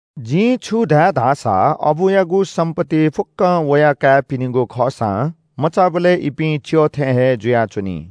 जिं छु धाये धाःसा – अबुयागु सम्‍पत्ति फुक्‍कं वया काय्‌पिनिगु खःसां मचाबलय् इपिं च्‍यः थें हे जुयाच्‍वनी।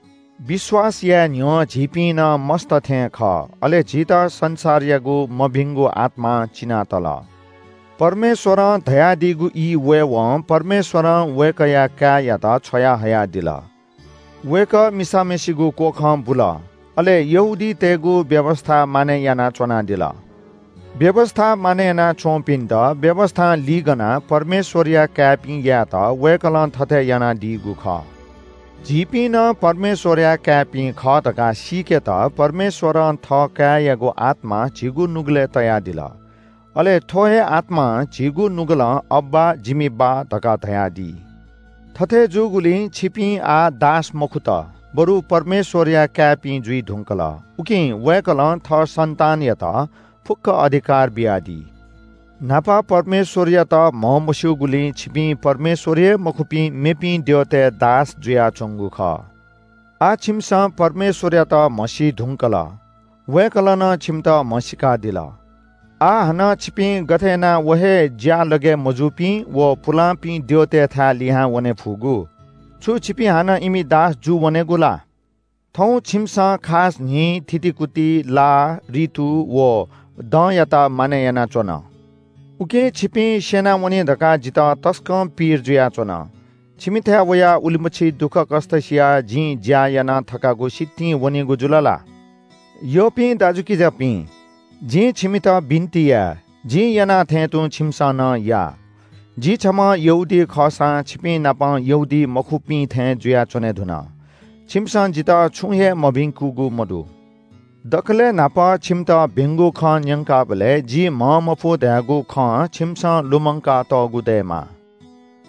विश्‍वास याये न्‍ह्यः झीपिं नं मस्‍त थें खः, अले झीत संसारयागु मभिंगु आत्‍मां चिनातल। परमेश्‍वरं धयादीगु ई वयेवं परमेश्‍वरं वय्‌कःया काय्‌यात छ्वयाहयादिल। वय्‌कः मिसाम्‍हय्‌सिगु क्‍वखं बुल। अले यहूदीतय्‌गु व्‍यवस्‍था मानय् यानाः च्‍वनादिल। व्‍यवस्‍था मानय् यानाच्‍वंपिन्‍त व्‍यवस्‍थां लिगनाः परमेश्‍वरया काय्‌पिं यायेत वय्‌कलं थथे यानादीगु खः। झीपिं नं परमेश्‍वरया काय्‌पिं खः धकाः सीकेत परमेश्‍वरं थः काय्‌यागु आत्‍मा झीगु नुगलय् तयादिल। अले थ्‍व हे आत्‍मां झीगु नुगलं “अब्‍बा, जिमि बाः” धकाः धयादी। थथे जूगुलिं छिपिं आः दास मखुत, बरु परमेश्‍वरया काय्‌पिं जुइ धुंकल। उकिं वय्‌कलं थः सन्‍तानयात फुक्‍क अधिकार बियादी। न्‍हापा परमेश्‍वरयात म्‍हमस्‍यूगुलिं छिपिं परमेश्‍वर हे मखुपिं मेपिं द्यःतय् दास जुयाच्‍वंगु खः। आः छिमिसं परमेश्‍वरयात म्‍हसी धुंकल। वय्‌कलं नं छिमित म्‍हसीकादिल। आः हानं छिपिं गथे यानाः व हे ज्‍यालगय् मजूपिं व पुलांपिं द्यःतय्‌थाय् लिहां वनेफुगु? छु छिपिं हानं इमि दास जूवनेगु ला? थौं छिमिसं खास न्‍हि, थितिकुति, ला, रितु व दँयात मानय् यानाच्‍वन। उकिं छिपिं स्‍यनावनी धकाः जितः तसकं पीर जुयाच्‍वन। छिमिथाय् वयाः उलिमछि दुःखकष्‍ट सियाः जिं ज्‍या याना थकागु सितिं वनीगु जुल ला? यःपिं दाजुकिजापिं, जिं छिमित बिन्‍ति याये – जिं याना थें तुं छिमिसं नं या। जि छम्‍ह यहूदी खःसां छिपिंनाप यहूदीमखुपिं थें जुयाच्‍वने धुन। छिमिसं जितः छुं हे मभिंकूगु मदु। दकलय् न्‍हापा छिमित भिंगु खँ न्‍यंकाबलय् जि म्‍हंमफु धयागु खँ छिमिसं लुमंकातःगु दयेमाः।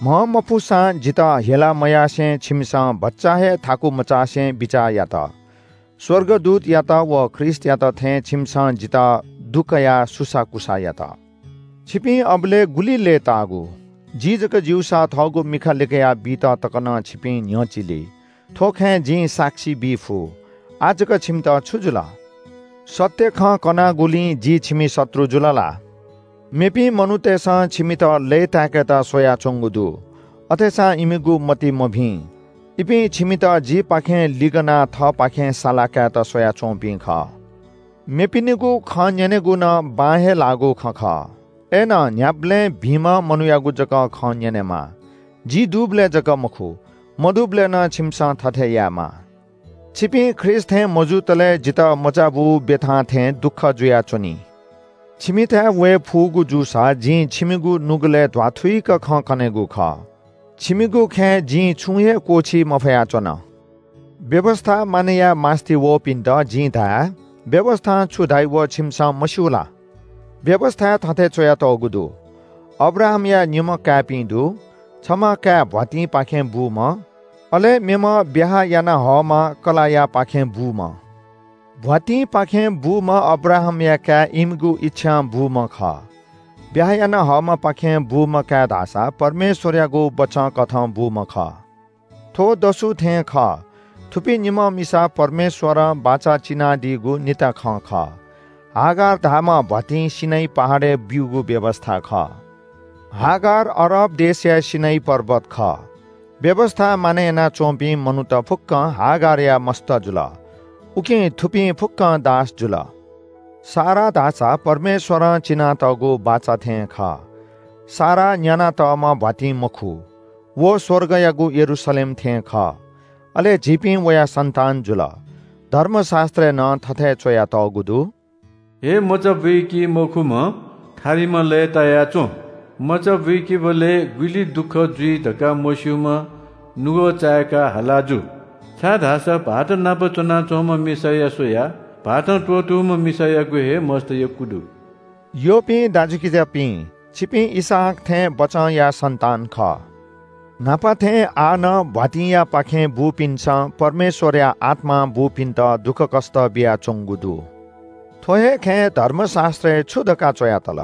म्‍हंमफुसां जितः हेला मयासें छिमिसं भचा हे थाकु मचासे बिचाः यात। स्‍वर्गदूतयात व ख्रीष्‍टयात थें छिमिसं जितः दुकयाः सुसाःकुसाः यात। छिपिं अबलय् गुलि लय्‌ताःगु। जि जक ज्‍यूसा थःगु मिखा लिकया बीत तक नं छिपिं न्‍ह्यचिली। थ्‍व खँय् जिं साक्षी बी फु। आः जक छिमित छु जुल? सत्‍य खँ कनागुलिं जि छिमि शत्रु जुल ला? मेपिं मनूतय्‌सं छिमित लय्‌ताय्‌केत स्‍वयाच्‍वंगु दु, अथेसां इमिगु मति मभिं। इपिं छिमित जिपाखें लिगनाः थःपाखे साला कायेत स्‍वयाच्‍वंपिं खः। मेपिनिगु खँ न्‍यनेगु नं बां हे लाःगु खँ खः। अय्‌नं न्‍ह्याबलें भिंम्‍ह मनूयागु जक खँ न्‍यनेमाः। जि दुबलय् जक मखु, मदुबलय् नं छिमिसं थथे यायेमाः। छिपिं ख्रीष्‍ट थें मजुतले जितः मचाबू ब्‍यथा थें दुःख जुयाच्‍वनी। छिमिथाय् वये फुगु जूसा जिं छिमिगु नुगलय् ध्‍वाथुइक खँ कनेगु खः। छिमिगु खँय् जिं छुं हे क्‍वःछी मफया च्‍वन। व्‍यवस्‍था मानय् याये मास्‍ति वःपिन्‍त जिं धाये – व्‍यवस्‍थां छु धाइ व छिमिसं मस्‍यू ला? व्‍यवस्‍थाय् थथे च्‍वयातःगु दु – अब्राहामया निम्‍ह काय्‌पिं दु। छम्‍ह काय् भ्‍वातिंपाखें बूम्‍ह, अले मेम्‍ह ब्‍याहा यानाहःम्‍ह कलाःयापाखें बूम्‍ह। भ्‍वातिंपाखें बूम्‍ह अब्राहामया काय् इमिगु इच्‍छां बूम्‍ह खः। ब्‍याहा याना हःम्‍हपाखें बूम्‍ह काय् धाःसा परमेश्‍वरयागु बचंकथं बूम्‍ह खः। थ्‍व दसु थें खः। थुपिं निम्‍ह मिसा परमेश्‍वरं बाचा चिनादीगु निता खँ खः। हागार धाःम्‍ह भ्‍वातिं सीनै पहाडय् ब्‍यूगु व्‍यवस्‍था खः। हागार अरब देशया सीनै पर्वत खः। व्‍यवस्‍था मानय् यानाच्‍वंपिं मनूत फुक्‍कं हागारया मस्‍त जुल, उकिं थुपिं फुक्‍कं दास जुल। सारा धाःसा परमेश्‍वरं चिनातःगु बाचा थें खः। सारा न्‍यानातःम्‍ह भ्‍वातिं मखु, व स्‍वर्गयागु यरूशलेम थें खः। अले झीपिं वया सन्‍तान जुल। धर्मशास्‍त्रय् नं थथे च्‍वयातःगु दु – “हे मचा बुइकिमखुम्‍ह थारिम्‍ह लय्‌ताया च्‍वँ, मचा बुइकेबलय् गुलि दुःख जुइ धकाः मस्‍यूम्‍ह नुगः चाय्‌काः हाला जु। छाय्‌धाःसा भाःतनाप च्‍वनाच्‍वंम्‍ह मिसाया स्‍वयाः भाःतं त्‍वःतूम्‍ह मिसायागु हे मस्‍त यक्‍व दु।” यःपिं दाजुकिजापिं, छिपिं इसहाक थें बचंया सन्‍तान खः। न्‍हापा थें आः नं भ्‍वातिंयापाखें बूपिन्‍सं परमेश्‍वरया आत्‍मां बूपिन्‍त दुःखकष्‍ट बियाच्‍वंगु दु। थ्‍व हे खँय् धर्मशास्‍त्रय् छु धकाः च्‍वया तल?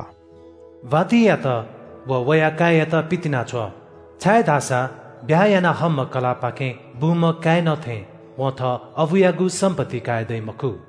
“भ्‍वातिंयात व वया काय्‌यात पितिनाछ्व। छाय्‌धाःसा ब्‍याहा यानाहःम्‍ह कलाःपाखें बूम्‍ह काय्‌नं थें वं थः अबुयागु सम्‍पत्ति काये दइ मखु।”